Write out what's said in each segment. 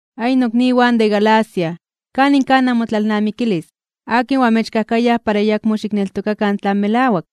¡Ay, nokniwan de Galacia! ¿Kanin kaj namotlalnamikilis? ¿Akin oamechkajkayaj para ayakmo xikneltokakan tlan melawak?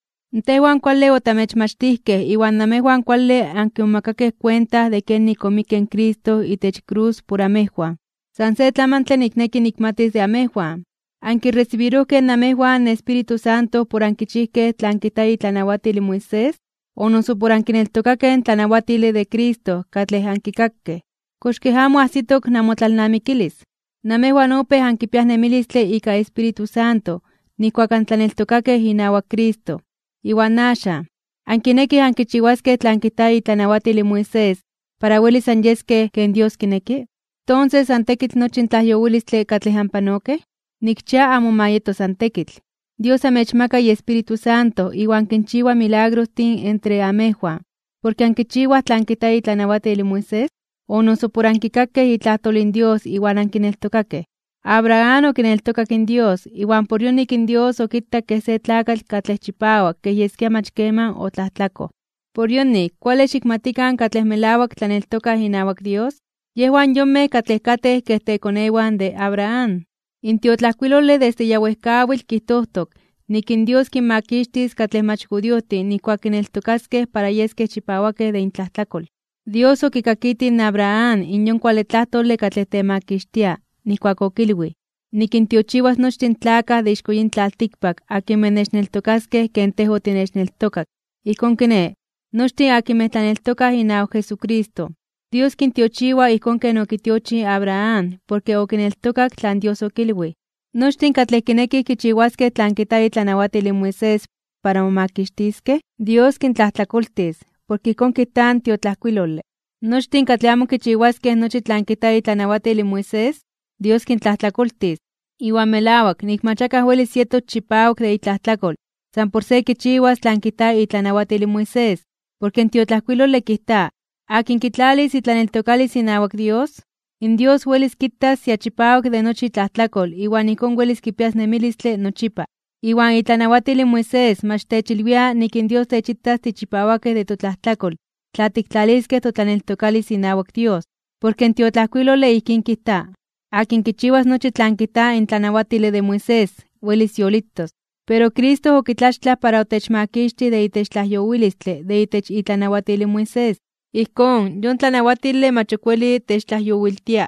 Tejwan kuale otamechmachtijkej iwan namejwan kuale ankimomakakej kuenta de kenik omikke in Cristo itech krus por amejwan. San se tlamantle nikneki nikmatis de amejwan: ¿Ankiresibirojkej namejwan in Espíritu Santo por ankichijkej tlan kijta itlanawatil in Moisés, o noso por ankineltokakej in tlamachtile de Cristo katlej ankikakej? ¿Kox kej amo ajsitok namotlalnamikilis? Namejwan opéj ankipiaj nemilistle ika Espíritu Santo nijkuak antlaneltokakej inawak Cristo. Iwan axan, ¿ankinekij ankichiwaskej tlan kijta itlanawatil in Moisés para welis anyeskej ken Dios kineki? ¿Tonses san tekitl nochi in tlajyowilistle katlej anpanokej? Nikchia amo ma yeto san tekitl. ¿Dios amechmaka iEspíritu Santo iwan kinchiwa milagrostin entre namejwan, porke ankichiwaj tlan kijta itlanawatil in Moisés? ¿O noso por ankikakej itlajtol in Dios iwan ankineltokakej? Abraham okineltokak in Dios, iwan por yonik in Dios okitak kej se tlakatl katlej chipawak kej yeskia mach keman otlajtlakoj. Por yonik, kuale xikmatikan ke katlej melawak tlaneltokaj inawak Dios, yejwan yonmej katlej katej kej tekonewan de Abraham. In tiotlajkuilole desde ya wejkawitl kijtojtok nik in Dios kinmakixtis katlej mach judiojtin nijkuak kineltokaskej para yeskej chipawakej de intlajtlakol. Dios okikakitij in Abraham in yon kuale tlajtole katlej temakixtia, nijkuak okilwij: “Nikintiochiwas nochtin in tlakaj de ixko yin tlaltikpak akinmej nechneltokaskej ken tej otinechneltokak.” Ijkón kiné, nochtin akinmej tlaneltokaj inawak Jesucristo, Dios kintiochiwa ijkón ken okitiochij in Abraham porke okineltokak tlan Dios okilwij. Nochtin katlej kinekij kichiwaskej tlan kijta itlanawatil in Moisés para momakixtiskej, Dios kintlajtlakoltis, porke ijkón kijta in tiotlajkuilole: “Nochtin katlej amo kichiwaskej nochi tlan kijta itlanawatil in Moisés, Dios kintlajtlakoltis.” Iwan melawak nik mach akaj welis yetos chipawak de itlajtlakol san por se kichiwas tlan kijta itlanawatil in Moisés. Porke in tiotlajkuilole kijta: “Akin kitlalis itlaneltokalis inawak Dios, in Dios kitas ya chipawak de nochi itlajtlakol iwan ijkón welis kipias nemilistle nochipa.” Iwan itlanawatil in Moisés mach techilwia nik in Dios techitas tichipawakej de totlajtlakol tla tiktlaliskej totlaneltokalis inawak Dios. Porke in tiotlajkuilole ijkín kijta: “Akin kichiwas nochi tlan kijta in tlanawatile de Moisés, welis yolitos.” Pero Cristo okitlaxtlaj para otechmakixtij de itech tlajyowilistle de itech itlanawatil in Moisés. Ijkón, yon tlanawatile mach ok weli techtlajyowiltia.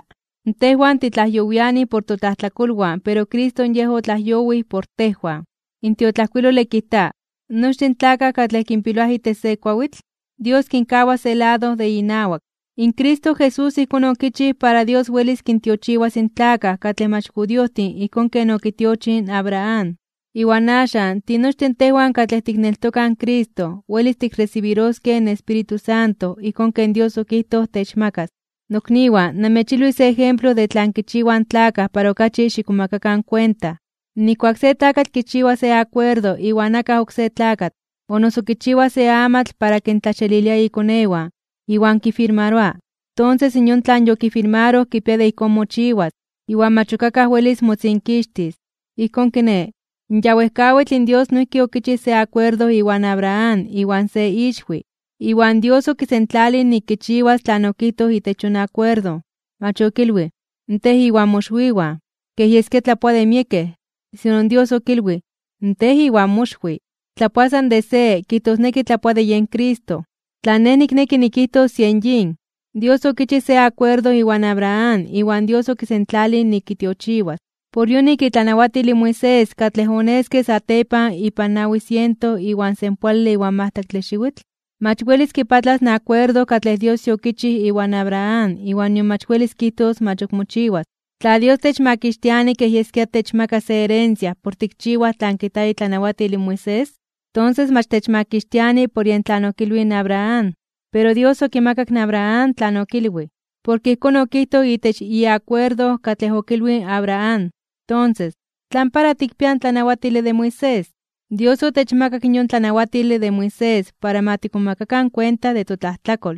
Tejwan titlajyowiani por totlajtlakolwan pero Cristo yen otlajyowij por tejwan. In tiotlajkuilole kijta: “Nochtin tlakaj katlej kinpiloaj itech se kuawitl, Dios kinkawa se lado de inawak.” In Cristo Jesús ijkón okichij para Dios welis kintiochiwas in tlakaj katlej mach judiojtin ijkón ken okitiochij in Abraham. Iwan axan tinochtin tejwan katlej tikneltokaj in Cristo welis tikresibiroskej in Espíritu Santo ijkón ken Dios okijtoj techmakas. Nokniwan, namechilwis se ejemplo de tlan kichiwaj in tlakaj para okachi xikmomakakan kuenta. Nijkuak se tlakatl kichiwa se akuerdo iwan akaj oksé tlakatl, o noso kichiwa se amatl para kintlaxelilia ikonewan, iwan kifirmaroa, tonses yon tlan yokifirmaroj kipia de ijkón mochiwas, iwan mach ok akaj welis motzinkixtis. Ijkón kiné, ya wejkawitl in Dios noijki okichij se akuerdo iwan Abraham iwan se ixwi. Iwan Dios okisentlalij nik kichiwas tlan okijtoj itech yon akuerdo. Mach okilwij: “tej iwan moxwiwan”, kej yeskia tlapoa de miekej, sino Dios okilwij: “tej iwan moxwi”. Tlapoa san de se, kijtosneki tlapoa de yen Cristo. Tlan nej nikneki nikijtos yen yin: Dios okichij se akuerdo iwan Abraham iwan Dios okisentlalij nik kitiochiwas. Por yonik itlanawatil in Moisés katlej oneske satepan ipan nawi siento iwan senpoale iwan majtlaktle xiwitl, mach welis kipatlas in akuerdo katlej Dios yokichij iwan Abraham iwan nion mach welis kijtos mach ok mochiwas. Tla Dios techmakixtiani kej yeskia techmaka se herencia por tikchiwaj tlan kijta itlanawatil in Moisés, tonses mach techmakixtiani por yen tlan okilwij in Abraham. Pero Dios okimakak in Abraham tlan okilwij, porke ijkón okijtoj itech iakuerdo katlej okilwij in Abraham. Tonses, ¿tlan para tikpiaj in tlanawatile de Moisés? Dios okitemakak in yon tlanawatile de Moisés para ma tikmomakakan kuenta de totlajtlakol.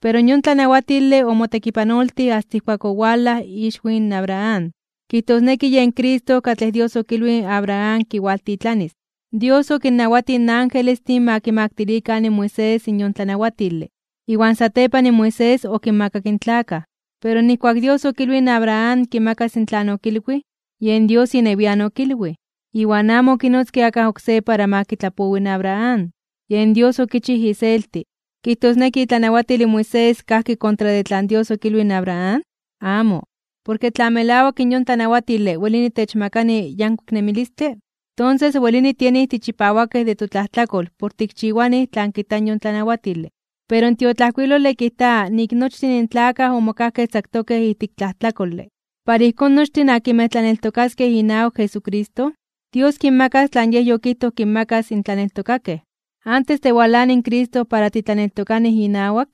Pero yon tlanawatile omotekipanoltij asta ijkuak owalaj ixwi in Abraham, kijtosneki yen Cristo katlej Dios okilwij in Abraham kiwaltitlanis. Dios okinnawatij in angelestin ma kimaktilikan in Moisés in yon tlanawatile, iwan satepan Moisés okinmakak in tlakaj. Pero nijkuak Dios okilwij in Abraham kimakas tlan okilwij, yen Dios inewian okilwij, iwan amo okinotzke akaj oksé para ma kitlapowi in Abraham. Yen Dios okichij iselti. ¿Kijtosneki itlanawatil in Moisés kajki kontra de tlan Dios okilwij in Abraham? Amo. Porke tla melawak in yon tlanawatile welini techmakani yankuik nemilistle, tonses welini tienij tichipawakej de totlajtlakol por tikchiwanij tlan kijta in yon tlanawatile. Pero in tiotlajkuilole kijta nik nochtin in tlakaj omokajkej tzaktokej ijtik tlajtlakole. Para ijkón nochtin akinmej tlaneltokaskej inawak Jesucristo, Dios kinmakas tlan Yej yokijtoj kinmakas in tlaneltokakej. Antes de walani in Cristo para titlaneltokanij inawak,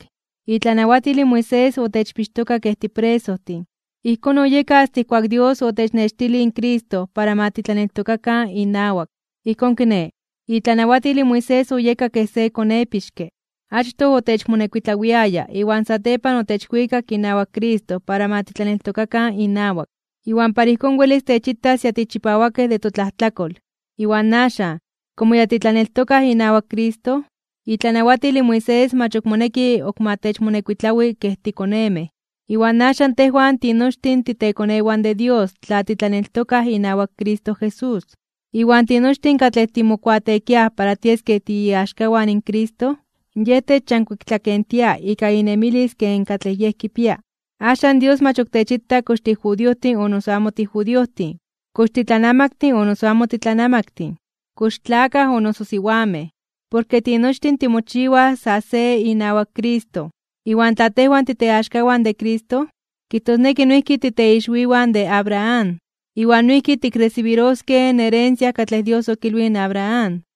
itlanawatil in Moisés otechpixtoka kej tipresojtin. Ijkón oyeka asta ijkuak Dios otechnextilij in Cristo para ma titlaneltokakan inawak. Ijkón kiné, itlanawatil in Moisés oyeka kej se konepixke. Achtoj otechmonekuitlawiaya iwan satepan otechwikak inawak Cristo para ma titlaneltokakan inawak, iwan para ijkón welis techitas ya tichipawakej de totlajtlakol. Iwan axan, komo ya titlaneltokaj inawak Cristo, itlanawatil in Moisés mach ok moneki ok ma techmonekuitlawi kej tikonemej. Iwan axan tejwan tinochtin titekonewan de Dios tla titlaneltokaj inawak Cristo Jesús. Iwan tinochtin katlej timokuateekiaj para tieskej tiiaxkawan in Cristo, Yej techyankuiktlakentia ika inemilis ken katlej Yej kipia. Axan Dios mach ok techita kox tijudiojtin o noso amo tijudiojtin, kox titlanamaktin o noso amo titlanamaktin, kox tlakaj o noso siwamej. Porke tinochtin timochiwaj sa se inawak Cristo. Iwan tla tejwan titeaxkawan de Cristo, kijtosneki noijki titeixwiwan de Abraham, iwan noijki tikresibiroskej in herencia katlej Dios okilwij in Abraham.